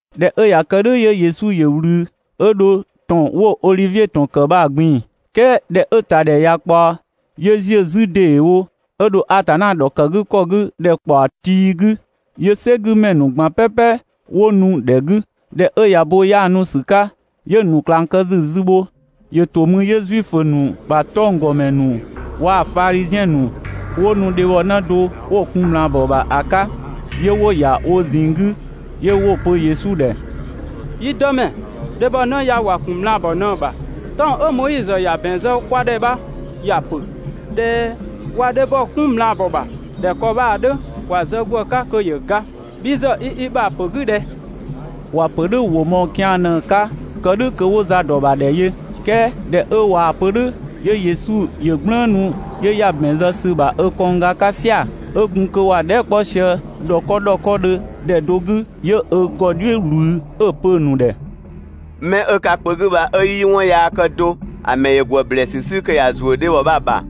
꞊Dhɛ 'ö ꞊ya kë "dhʋ̈ 'yö Yesu ‑yö ꞊wlü 'ö dho ‑tɔn 'wo Odhivie ‑tɔn ‑kë bha‑ ꞊gbin‑. "Kɛɛ ꞊dhɛ 'ö‑ ‑ta ‑dhɛ ꞊ya ꞊kpaɔ, 'yö ‑ziö 'zü ‑deewo 'ö dho Atanna ‑dhɔkëgükɔ 'gü ‑dhɛkpaɔ tii 'gü, 'yö "sɛgümɛ ‑nu ꞊gban "pɛpɛ 'wo nu‑ ‑dhɛ 'gü. ꞊Dhɛ 'ö ꞊ya bo 'yaanu ‑sü 'ka, 'yö‑ ‑nu ꞊klang kë ‑sü zü bho. ‑Yö ‑to mü 'yö Zuifö ‑nu ‑bha 'tɔnggɔmɛ ‑nu waa‑ Fadhiziɛn ‑nu 'wo nu dhebhɔnë do 'wo‑ kun ꞊mlaabɔ ‑bha ‑a 'ka. 'Yö 'wo‑ ‑ya wo ꞊zinng 'gü, 'yö 'wo‑ pö Yesu ‑dhɛ: «Yi Dëmɛ, dhebhɔnë ya ‑wa ‑kun ꞊mlaabɔ ꞊në‑ ‑bha. 'Tɔng‑ 'ö Moizö ‑ya ‑bɛn zë kwa ‑dhɛ bha ‑ya ‑pö ꞊dhɛ ꞊wa dhebhɔ 'kun ꞊mlaabɔ ‑bha ꞊dhɛ ‑kɔ bha‑ 'dhö, ‑wa zë ‑gwë 'ka kö ‑yö ga. Bhi ‑zë i i ‑bha ‑pö 'gü ꞊dhɛ?» ‑Wa ‑pö "dhʋ̈‑ ‑wʋ mɔɔ‑ kian ꞊në‑ 'ka kë "dhʋ̈ kö 'wo za ‑dɔ ‑bha ‑dhɛ yö. "Kɛɛ ꞊dhɛ 'ö ꞊waa‑ pö "dhʋ̈, 'yö Yesu ‑yö "gblëënu, 'yö ‑ya ‑bɛn zë ‑sü ‑bha ö kɔngga 'ka "sia‑. 'Ö gun kö ‑wa dhɛɛ" 'kpɔ sië ‑dhɔkɔ ‑dhɔkɔdhö ‑dhɛ do 'gü, 'yö ö ‑gɔ "dhiʋ̈ ꞊wlü 'ö‑ pö‑ ‑nu ‑dhɛ: «'Mɛ 'ö ka kpö 'gü bha 'ö 'yii 'wɔn yaa kë do ‑a ‑mɛ ‑yö ‑gwë ‑blɛɛsü 'sü kö ‑ya ‑zuö dhebhɔ bha‑ ‑bha.»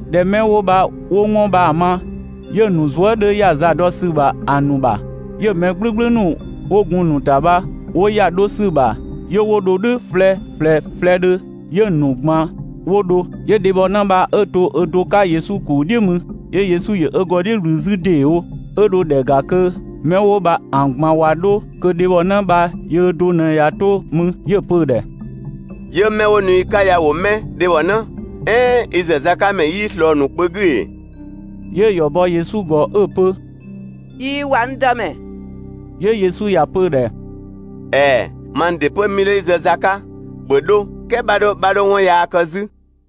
꞊Dhɛ 'mɛ 'wo bha 'wo 'wɔn bha‑ ma, ('yö‑ ‑nu zuë" 'dhö ‑ya za dɔ ‑sü ‑bha ‑a ‑nu ‑bha,) 'yö‑ mɛ "gblʋ̈gblʋ̈ ‑nu 'wo gun‑ ‑nu ‑ta bha 'wo ‑ya 'dho ‑sü ‑bha, 'yö 'wo dho "dhʋ̈ flɛ ꞊flɛ flɛdhö ('yö‑ ‑nu ꞊gban 'wo dho). 'Yö dhebhɔnë bha 'ö to ö do 'ka Yesu ‑kuu "dhiʋ̈ mü. 'Yö Yesu ‑yö ö ‑gɔ "dhiʋ̈ ꞊wlü 'zü ‑deewo, ('ö dho ‑dhɛ ‑ga kö 'mɛ 'wo bha‑ ꞊gban ꞊wa 'dho kö dhebhɔ bha yöö do ꞊në ꞊ya 'to mü). 'Yö‑ pö‑ ‑dhɛ: «'Yö 'mɛ 'wo nu i 'ka ya ‑wo 'mɛ, dhebhɔnë? "Ɛɛn i ‑zëzakamɛ 'yii ꞊slɔɔ‑ ‑nu kpö 'gü ‑ee?» 'Yö‑ ‑yɔ bɔ Yesu ‑gɔ 'ö‑ pö: «꞊Iin ‑wa, n Dëmɛ.» 'Yö Yesu ‑ya pö‑ ‑dhɛ: «‑Ɛɛ! Mang ‑dɩ 'pö 'mii 'dho i zë za 'ka. ‑Bhö 'dho, "kɛɛ 'bha 'dho, 'bha 'dho 'wɔn yaa kë 'zü!»]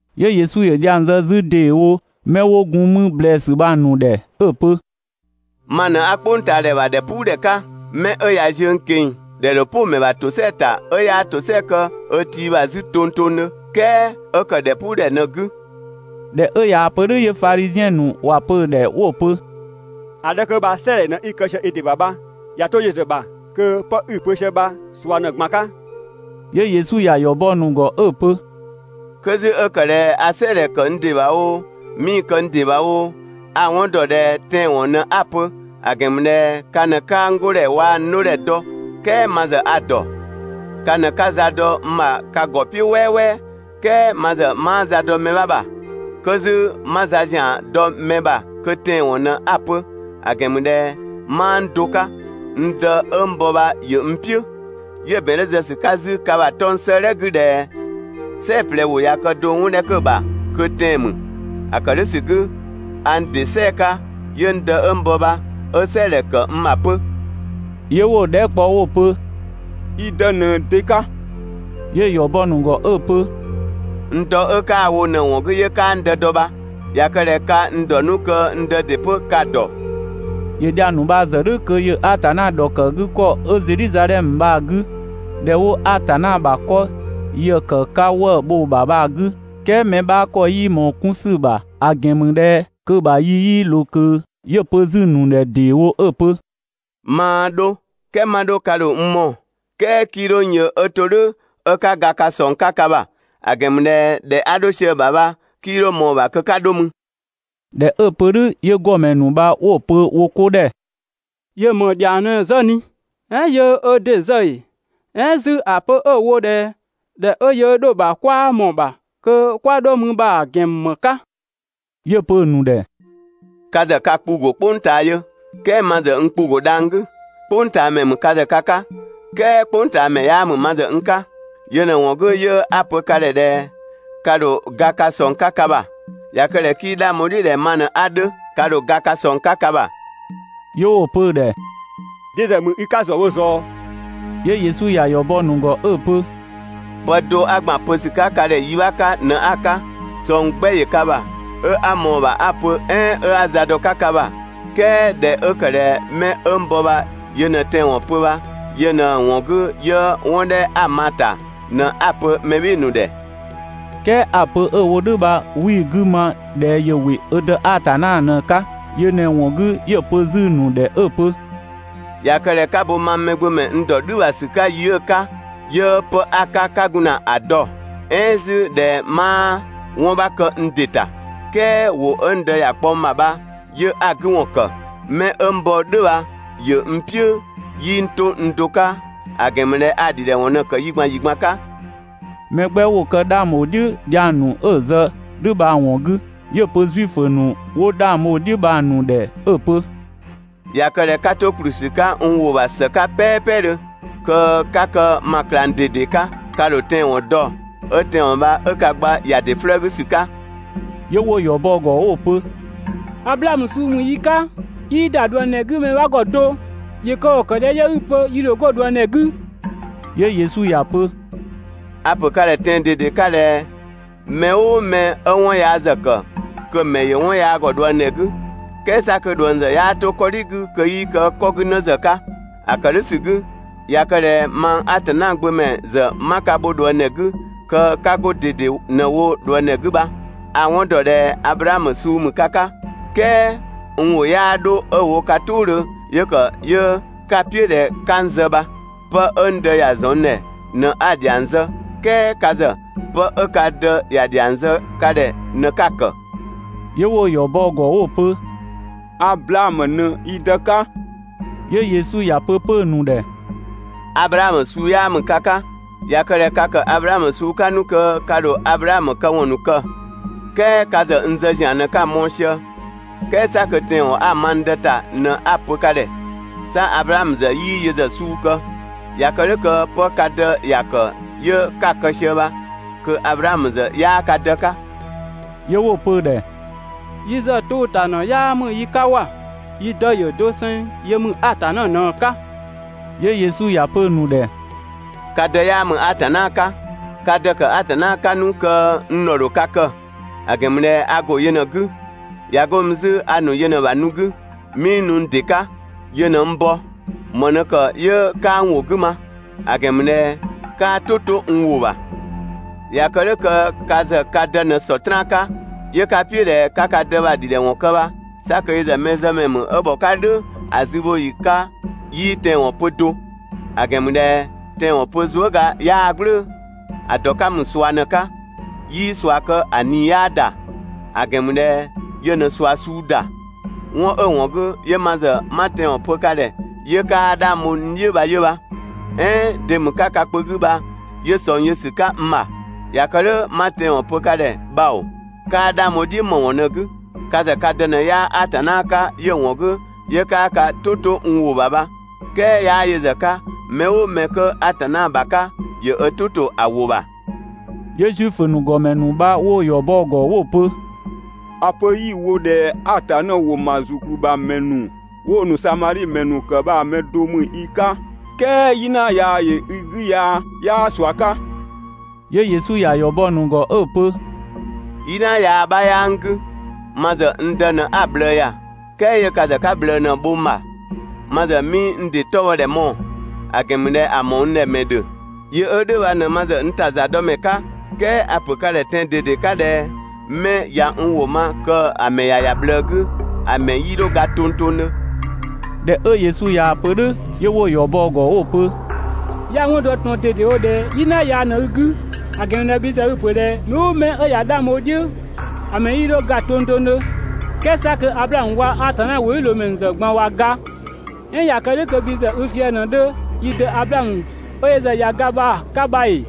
'Yö Yesu ‑yö dhiang zë 'zü ‑deewo 'mɛ 'wo gun mü ‑blɛɛsü bha‑ ‑nu ‑dhɛ 'ö‑ pö: «Ma ꞊në 'a "kpʋngtaadhɛ ‑bha ‑dhɛpuudhɛ 'ka. 'Mɛ 'ö ꞊ya ziö n ꞊keng‑, ‑dhɛ ‑dho "pʋ‑ ‑mɛ ‑bha ‑tosɛa ‑ta 'ö 'yaa ‑tosɛa kë ö tii ‑bha 'zü tongtongdhö, "kɛɛ 'ö‑ ‑kë ‑dhɛpuudhɛ ꞊në‑ 'gü.» ꞊Dhɛ 'ö ꞊yaa‑ pö "dhʋ̈ 'yö Fadhiziɛn ‑nu ‑wa pö‑ ‑dhɛ 'wo‑ pö: «‑A 'dhɛ 'kö bha "sɛɛdhɛ ꞊në‑ kë sië i ‑dɩ ‑bha bha. ꞊Ya 'to yö ‑zë ‑bha kö 'pë 'i‑ pö sië bha ꞊sua ꞊në‑ ꞊gban 'ka.» 'Yö Yesu ‑ya ‑yɔ bɔ‑ ‑nu ‑gɔ 'ö‑ pö: «'Kö 'zü 'ö ‑kë ꞊dhɛ a "sɛɛdhɛ ‑kë n ‑dɩ ‑bha oo, 'mii‑ kë n ‑dɩ ‑bha oo, a‑ 'wɔn ‑dɔ ꞊dhɛ tɛanwɔn ꞊në 'a‑ pö, ‑a ‑gɛn ‑mü ꞊dhɛ ka ꞊në 'kaa n 'godhɛ waa‑ n 'dhodhɛ dɔ, "kɛɛ ma ‑zë a‑ ‑dɔ. Ka ꞊në 'ka za dɔ n ‑bha ka ‑gɔ "piʋ̈ "wɛɛwɛɛ, "kɛɛ ma ‑zë 'maa za dɔ mɛ 'bha ‑bha. 'Kö 'zü 'ma za ‑zian dɔ mɛ ‑bha kö tɛanwɔn ꞊në 'a‑ pö, ‑a ‑gɛn ‑mü ꞊dhɛ 'maa n do 'ka, n Dë 'ö n bɔ bha ‑yö n "piʋ̈. 'Yö‑ ‑bɛn 'dhö zë ‑sü 'ka 'zü ka ‑bha 'tɔng‑ 'sëëdhɛ 'gü ꞊dhɛ "sɛɛ‑ ꞊plɛ ‑wʋ ꞊ya kë do 'wɔn 'dhɛ 'kö‑ ‑bha kö tɛan‑ ‑mü. ‑A ‑kë "dhʋ̈ ‑sü 'gü, a n ‑dɩ "sɛɛ‑ 'ka, 'yö n Dë 'ö n bɔ bha 'ö "sɛɛdhɛ ‑kë n ‑bha 'pö.» 'Yö 'wo‑ dhɛɛ" kpɔ 'wo‑ pö: «I dë ꞊në de 'ka?» 'Yö‑ ‑yɔ bɔ‑ ‑nu ‑gɔ 'ö‑ pö: «N dɔ 'ö 'kaa‑ wo ꞊në‑ ‑wɔn 'gü 'yö 'kaa n Dë dɔ bha. ꞊Ya kë ꞊dhɛ ka n ‑dɔ 'nu kö n Dë ‑dɩ 'pö ka‑ ‑dɔ.» ‑Yö dhiang ‑nu bha‑ ‑zë "dhʋ̈ kö ‑yö Atanna ‑dhɔkëgükɔ 'ö Zedhizadhɛmö bha‑ 'gü, ‑dhɛ 'wo Atanna ‑bha 'kɔ ‑yë ‑kë 'ka 'wëë‑ bho‑ ‑bha bha‑ 'gü, "kɛɛ mɛ 'bha ‑kɔ 'yii ꞊mɔɔ‑ 'kun ‑sü ‑bha, ‑a ‑gɛn ‑mü ꞊dhɛ kö‑ ‑bha yi 'yii ꞊loo ꞊kö. 'Yö‑ pö 'zü‑ ‑nu ‑dhɛ ‑deewo 'ö‑ pö: «Maa 'dho, "kɛɛ 'ma 'dho, ka ‑dho n mɔɔ‑, "kɛɛ 'kii 'dho n yö 'ö to "dhʋ̈ 'ö 'ka ga ka ꞊sɔng 'ka ka ‑bha; ‑a ‑gɛn ‑mü ꞊dhɛ ‑dhɛ 'a 'dho sië‑ ‑bha bha, 'kii 'dho ꞊mɔɔ‑ ‑bha kö 'ka 'dho mü.» ꞊Dhɛ 'ö‑ pö "dhʋ̈ 'yö ‑gɔmɛ ‑nu bha 'wo‑ pö wo 'ko ‑dhɛ: «‑Yö ‑më ‑dhiang ꞊në‑ zë ꞊ni? "Ɛɛn yöö ö ‑dɩ zë ‑ee?» "Ɛɛn 'zü ‑a pö 'ö‑ wo ꞊dhɛ ‑dhɛ 'ö yöö 'dho‑ ‑bha 'kwaa ꞊mɔɔ‑ ‑bha kö 'kwa dho mü bha‑ ‑gɛn ‑mü ‑më 'ka?» 'Yö‑ pö‑ ‑nu ‑dhɛ: «Ka ‑zë ka kpu‑ ‑go "kpʋng ꞊taa yö, "kɛɛ ma ‑zë n kpu‑ ‑go dhang‑ 'gü. "Kpʋngtaamɛ ‑mü ka ‑zë ka 'ka, "kɛɛ "kpʋngtaamɛ 'yaa ‑mü ma ‑zë n 'ka. Yö ꞊në‑ ‑wɔn 'gü 'yö 'a‑ pö ka ‑dhɛ ꞊dhɛ ka ‑dho ga ka ꞊sɔng 'ka ka ‑bha. ꞊Ya kë ꞊dhɛ kö 'kii 'dhang bho‑ "dhiʋ̈ ꞊dhɛ ma ꞊në 'a 'dhö 'ka, ka ‑dho ga ka ꞊sɔng 'ka ka ‑bha.» 'Yö 'wo‑ pö‑ ‑dhɛ: «De ‑zë ‑mü i 'ka ‑zë wo ꞊zɔɔ?» 'Yö Yesu ‑ya ‑yɔ bɔ‑ ‑nu ‑gɔ 'ö‑ pö: «Pë do 'a ‑gban pö ‑sü ‑bha ka ‑dhɛ 'yi bha‑ 'ka ꞊në 'a‑ 'ka. ꞊Sɔng 'gbɛ ‑yö ka ‑bha, 'ö 'a ꞊mɔɔ‑ 'nu‑ ‑bha 'a‑ pö "ɛɛn 'ö 'a za dɔ‑ 'ka ka ‑bha, "kɛɛ ꞊dhɛ 'ö ‑kë ꞊dhɛ 'mɛ 'ö n bɔ bha yö ꞊në tɛanwɔn pö bha, yö ꞊në‑ ‑wɔn 'gü 'yö 'wɔn 'dhɛ 'a‑ ma‑ ‑ta ꞊në 'a‑ pö mɛ "bhɩɩ‑ ‑nu ‑dhɛ.» "Kɛɛ ‑a pö 'ö‑ wo "dhʋ̈ bha 'wii‑ 'gü ma ꞊dhɛ ‑yö ‑wɩ ö Dë Atanna ꞊në‑ 'ka. Yö ꞊në‑ ‑wɔn 'gü 'yö‑ pö 'zü‑ ‑nu ‑dhɛ 'ö‑ pö: «꞊Ya kë ꞊dhɛ 'ka bo mang Mɛgbömɛ n ‑dɔ "dhü ‑bha ‑sü 'ka yi 'ö‑ 'ka, 'yö 'pë 'a‑ 'ka 'ka gun ‑na ‑a dɔ, "ɛɛn 'zü ꞊dhɛ 'maa 'wɔn 'bha kë n ‑dɩ ‑ta, "kɛɛ ‑wʋ 'ö n Dë ‑ya kpɔ n ‑bha 'yö 'a‑ 'gü ‑wɔn ‑kë. 'Mɛ 'ö n bɔ "dhʋ̈ bha ‑yö n "piʋ̈, 'yii n 'to n do 'ka, ‑a ‑gɛn ‑mü ꞊dhɛ a‑ ‑dhidhɛwɔn ꞊në‑ ‑kë yi ꞊gban ‑yi ꞊gban 'ka.» Mɛ 'gbɛ ‑wo kë 'dhang bho‑ "dhiʋ̈ dhiang ‑nu 'ö‑ zë "dhʋ̈ bha‑ ‑wɔn 'gü. 'Yö‑ pö Zuifö ‑nu 'wo 'dhang bho‑ "dhiʋ̈ bha‑ ‑nu ‑dhɛ 'ö‑ pö: «꞊Ya kë ꞊dhɛ 'ka 'to ‑kplü ‑sü 'ka n ‑wʋ ‑bha ‑së 'ka "pɛɛpɛdhö, kö 'ka kë ma ꞊klang ꞊dede 'ka. Ka ‑dho tɛanwɔn dɔ, 'ö tɛanwɔn bha 'ö ka gba ‑ya ‑dɩ 'flëë‑ 'gü ‑sü 'ka.» 'Yö 'wo‑ ‑yɔ bɔ‑ ‑gɔ 'wo‑ pö: «Ablaamö suu ‑mü yi 'ka, 'yii ‑da ꞊dhuëngdhɛ 'gü mɛ 'bha ‑gɔ do, ‑yö kë ‑kɔ ‑kë ꞊dhɛ 'yö 'i‑ pö yi ‑dho 'go ꞊dhuëngdhɛ 'gü?» 'Yö Yesu ‑ya pö: «A‑ ‑pö ka ‑dhɛ tɛan‑ ꞊dede 'ka ꞊dhɛ mɛ "ʋʋ mɛ 'ö 'wɔn yaa ‑zë ‑kë, kö‑ ‑mɛ ‑yö 'wɔn yaa ‑gɔ ꞊dhuëngdhɛ 'gü. "Kɛɛ 'sa kö ꞊dhuëng ‑zë 'yaa 'to 'kɔdhi 'gü kö 'yii kë 'kɔ 'gü 'në ‑zë 'ka. ‑A ‑kë "dhʋ̈ ‑sü 'gü, ꞊ya kë ꞊dhɛ mang Atanna gbö ‑mɛ ‑zë 'ma ka bho ꞊dhuëngdhɛ 'gü kö 'ka 'go ꞊dede ꞊në‑ wo ꞊dhuëngdhɛ 'gü bha. A‑ 'wɔn ‑dɔ ꞊dhɛ Ablaamö suu ‑mü ka 'ka, "kɛɛ n ‑wʋ 'yaa 'dho 'ö‑ wo ka "tʋʋdhö 'yö ‑kë 'yö ka "piʋ̈ ꞊dhɛ 'ka n zë bha. Pë 'ö n Dë ‑ya ‑zɔn n ‑dhɛ ꞊në 'a‑ ‑dhiang zë, "kɛɛ ka ‑zë, 'pë 'ö ka dë ‑ya ‑dhiang zë ka ‑dhɛ ꞊në 'ka‑ ‑kë.» 'Yö 'wo‑ ‑yɔ bɔ‑ ‑gɔ 'wo‑ pö: «Ablaamö ꞊në yi dë 'ka!» 'Yö Yesu ‑ya pö 'pö‑ ‑nu ‑dhɛ: «(Ablaamö suu 'yaa ‑mü ka 'ka!) ꞊Ya kë ꞊dhɛ ka ‑kë Ablaamö suu 'ka 'nu kö ka ‑dho Ablaamö këwɔn ‑nu kë. "Kɛɛ ka ‑zë n zë ‑zian ꞊në 'kaa‑ mɔɔ‑ sië, "kɛɛ 'sa kö tɛanwɔn 'a‑ ma n Dë ‑ta ꞊në 'a‑ pö ka ‑dhɛ. 'Sa Ablaamö ‑zë 'yii yö ‑zë suu kë!» ꞊Ya kë "dhʋ̈ kö 'pë ka dë ‑ya ‑kë 'yö 'ka‑ kë sië bha, (kö Ablaamö ‑zë 'yaa ka dë 'ka).» 'Yö 'wo‑ pö‑ ‑dhɛ: «Yi ‑zë 'tʋʋ‑ ‑ta ‑në 'yaa ‑mü yi 'ka ‑wa. Yi dë ‑yö doseng yö ‑mü Atanna ꞊në‑ 'ka!» 'Yö Yesu ‑ya pö‑ ‑nu ‑dhɛ: «Ka dë 'yaa ‑mü Atanna 'ka! Ka dë‑ ‑kë Atanna 'ka 'nu kö n ‑dhɔ ‑dho ka kë. ‑A ‑gɛn ‑mü ꞊dhɛ a ‑go yö ꞊në‑ 'gü. ꞊Ya 'go mü 'zü a ‑nu yö ꞊në‑ ‑bha nu 'gü. 'Mii nu n ‑dɩ 'ka, yö ꞊në n bɔ. ‑Më ꞊në ‑kë 'yö 'kaa n ‑wʋ 'gü ma? ‑A ‑gɛn ‑mü ꞊dhɛ 'kaa "tʋ 'to n ‑wʋ ‑bha! ꞊Ya kë "dhʋ̈ kö ka ‑zë ka dë ꞊në Sɔtraan 'ka, 'yö 'ka‑ "piʋ̈ ꞊dhɛ 'ka ka dë bha‑ ‑dhidhɛwɔn kë bha, 'sa kö yö ‑zë mɛzëmɛ ‑mü 'ö ‑bhɔ 'ka "dhʋ̈ ‑a zübhoyi 'ka 'yii tɛanwɔn pö do, ‑a ‑gɛn ‑mü ꞊dhɛ tɛanwɔn pö zuëga 'yaa‑ "gblʋ̈ʋ̈‑, ‑a ‑dɔ 'ka ‑mü ꞊sua ꞊në‑ 'ka, 'yii ꞊sua kë‑ ꞊nii 'yaa ‑da, ‑a ‑gɛn ‑mü ꞊dhɛ yö ꞊në ꞊sua suu ‑da. 'Wɔn 'ö‑ ‑wɔn 'gü, 'yö ma ‑zë 'ma tɛanwɔn pö ka ‑dhɛ 'yö 'kaa 'dhang bho n "dhiʋ̈ bha 'yö bha. "Ɛɛn de ‑mü 'ka ka kpö 'gü bha 'yö ꞊sɔng yö ‑sü 'ka n ‑bha? ꞊Ya kë "dhʋ̈ 'ma tɛanwɔn pö ka ‑dhɛ bha ‑oo! 'Kaa 'dhang bho‑ "dhiʋ̈ ‑më ‑wɔn ꞊në‑ 'gü? Ka ‑zë ka dë ꞊në 'yaa Atanna 'ka 'yö‑ ‑wɔn 'gü 'yö 'kaa ka "tʋ 'to n ‑wʋ ‑bha bha, "kɛɛ 'yaa yö ‑zë 'ka, mɛ "ʋʋ mɛ 'kö Atanna ‑bha 'ka, ‑yö ö "tʋ ‑to ‑a ‑wʋ ‑bha!» 'Yö Zuifö ‑nu ‑gɔmɛ ‑nu bha 'wo‑ ‑yɔ bɔ‑ ‑gɔ 'wo‑ pö: «‑A pö 'yi‑ wo ꞊dhɛ Atanna ‑wɔn ‑ma ‑zukplü ‑bha ‑mɛ ‑nu 'wo‑ ‑nu Samadhi ‑mɛ ‑nu ‑kë bha‑ mɛ do ‑mü i 'ka, "kɛɛ "yina yaa ‑yö i 'gü ya 'yaa ꞊sua 'ka.» 'Yö Yesu ꞊ya ‑yɔ bɔ‑ ‑nu ‑gɔ 'pö 'ö‑ pö: «"Yina yaa 'bha 'yaa n 'gü, ma ‑zë n Dë ꞊në 'a‑ ꞊bhlëë ‑ya, "kɛɛ 'yö ka ‑zë 'ka ꞊bhlëë ꞊në‑ bho n ‑bha. Ma ‑zë 'mii n ‑dɩ 'tɔbhɔdhɛ mɔɔ‑, ‑a ‑gɛn ‑mü ꞊dhɛ ‑a ‑mɔɔ n ‑dhɛ ‑mɛ ‑dhö, yö 'ö "dhʋ̈ bha ꞊në ma ‑zë n ‑ta ‑zadɔmɛ 'ka. "Kɛɛ a‑ pö ka ‑dhɛ tɛan‑ ꞊dede 'ka ꞊dhɛ 'mɛ ꞊ya n ‑wʋ ma kö‑ ‑mɛ ‑ya ‑ya ꞊bhlëë 'gü, ‑a ‑mɛ 'yii 'dho ga tongtongdhö.» ꞊Dhɛ 'ö Yesu ꞊yaa‑ pö "dhʋ̈ 'yö 'wo‑ ‑yɔ bɔ‑ ‑gɔ 'wo‑ pö: «'Ya‑ 'wɔn dɔ ꞊tɔn ꞊dedewo ꞊dhɛ "yina yaa ꞊në i 'gü, ‑a ‑gɛn ‑mü ꞊dhɛ bhi ‑zë i‑ ‑pö ꞊dhɛ mɛ "ʋʋ mɛ 'ö ꞊ya 'dhang bho i "dhiʋ̈ ‑a ‑mɛ 'yii 'dho ga tongtongdhö, "kɛɛ 'sa kö Ablaamö waa‑ Atanna ‑wʋdhiʋ̈loomɛ ‑nu ‑zë ꞊gban ꞊wa ga. "Ɛɛn ꞊ya kë "dhʋ̈ kö bhi ‑zë i fië‑ ꞊në 'dhö yi dë Ablaamö 'ö yö ‑zë ꞊ya ga bha‑ 'ka bha ‑ee?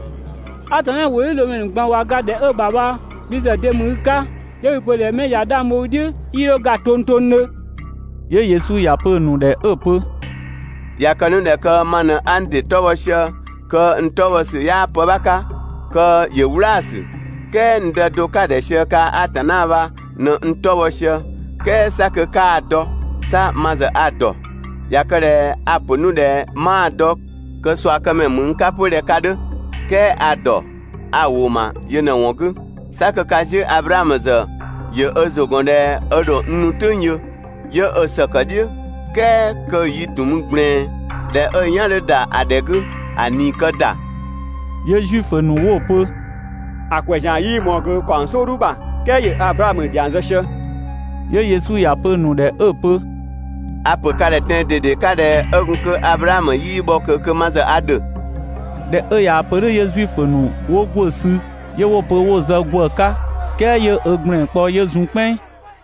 Atanna ‑wʋdhiʋ̈loomɛ ‑nu ꞊gban ꞊wa ga ‑dhɛ 'ö‑ ‑bha bha bhi ‑zë de ‑mü i 'ka ('yö 'i‑ pö 'mɛ ꞊ya 'dhang bho i "dhiʋ̈ 'yii 'dho ga tongtongdhö)?» 'Yö Yesu ‑ya pö‑ ‑nu ‑dhɛ 'ö‑ pö: ꞊Ya kë 'nu ꞊dhɛ kö ma ꞊në 'a n ‑dɩ 'tɔ bhɔ sië, kö n 'tɔ bhɔ ‑sü 'yaa pë 'bha 'ka, kö ‑yö "wlaasü, "kɛɛ n Dë do 'ka‑ ‑dhɛ sië kaa‑ Atanna bha ꞊në n 'tɔ bhɔ sië. "Kɛɛ 'sa kö 'kaa‑ dɔ, 'sa ma ‑zë a‑ ‑dɔ. ꞊Ya kë ꞊dhɛ a‑ ‑pö 'nu ꞊dhɛ 'maa‑ dɔ kö ꞊suakëmɛ ‑mü n 'ka 'pö ꞊dhɛ ka 'dhö. "Kɛɛ a‑ ‑dɔ, a‑ ‑wʋ ‑ma yö ꞊në‑ ‑wɔn 'gü. 'Sa kö ka 'ziʋ̈‑ Ablaamö ‑zë ‑yö ö ‑zʋ ‑gɔn ꞊dhɛ ö ‑dho n nu "tʋ̈ng yö, 'yö ö ‑sëkë "dhiʋ̈, "kɛɛ kö‑ yi‑ ‑tun mü ꞊gblɛɛn. ꞊Dhɛ 'ö‑ "yan 'dhö ‑da ‑a ‑dhɛ 'gü, ‑a ꞊nii‑ kë ‑da.» 'Yö Zuifö ‑nu 'wo‑ pö: «‑A ‑kwɛ ‑zian 'yii ꞊mɔɔ ꞊kö ‑kaɔng "sɔɔdhu ‑bha "kɛɛ ‑yö Ablaamö ‑dhiang zë sië!» 'Yö Yesu ‑ya pö‑ ‑nu ‑dhɛ 'ö‑ pö: «A‑ pö ka ‑dhɛ tɛan‑ ꞊dede 'ka ꞊dhɛ 'ö gun kö Ablaamö 'yii bhɔ ꞊kö kö ma ‑zë a ‑dhö.» ꞊Dhɛ 'ö ꞊yaa‑ pö "dhʋ̈ 'yö Zuifö ‑nu 'wo ‑gwë sü 'yö 'wo‑ pö 'wo‑ zë ‑gwë 'ka, "kɛɛ 'yö ö ‑gblɛn kpɔ 'yö zun "kpɛnng.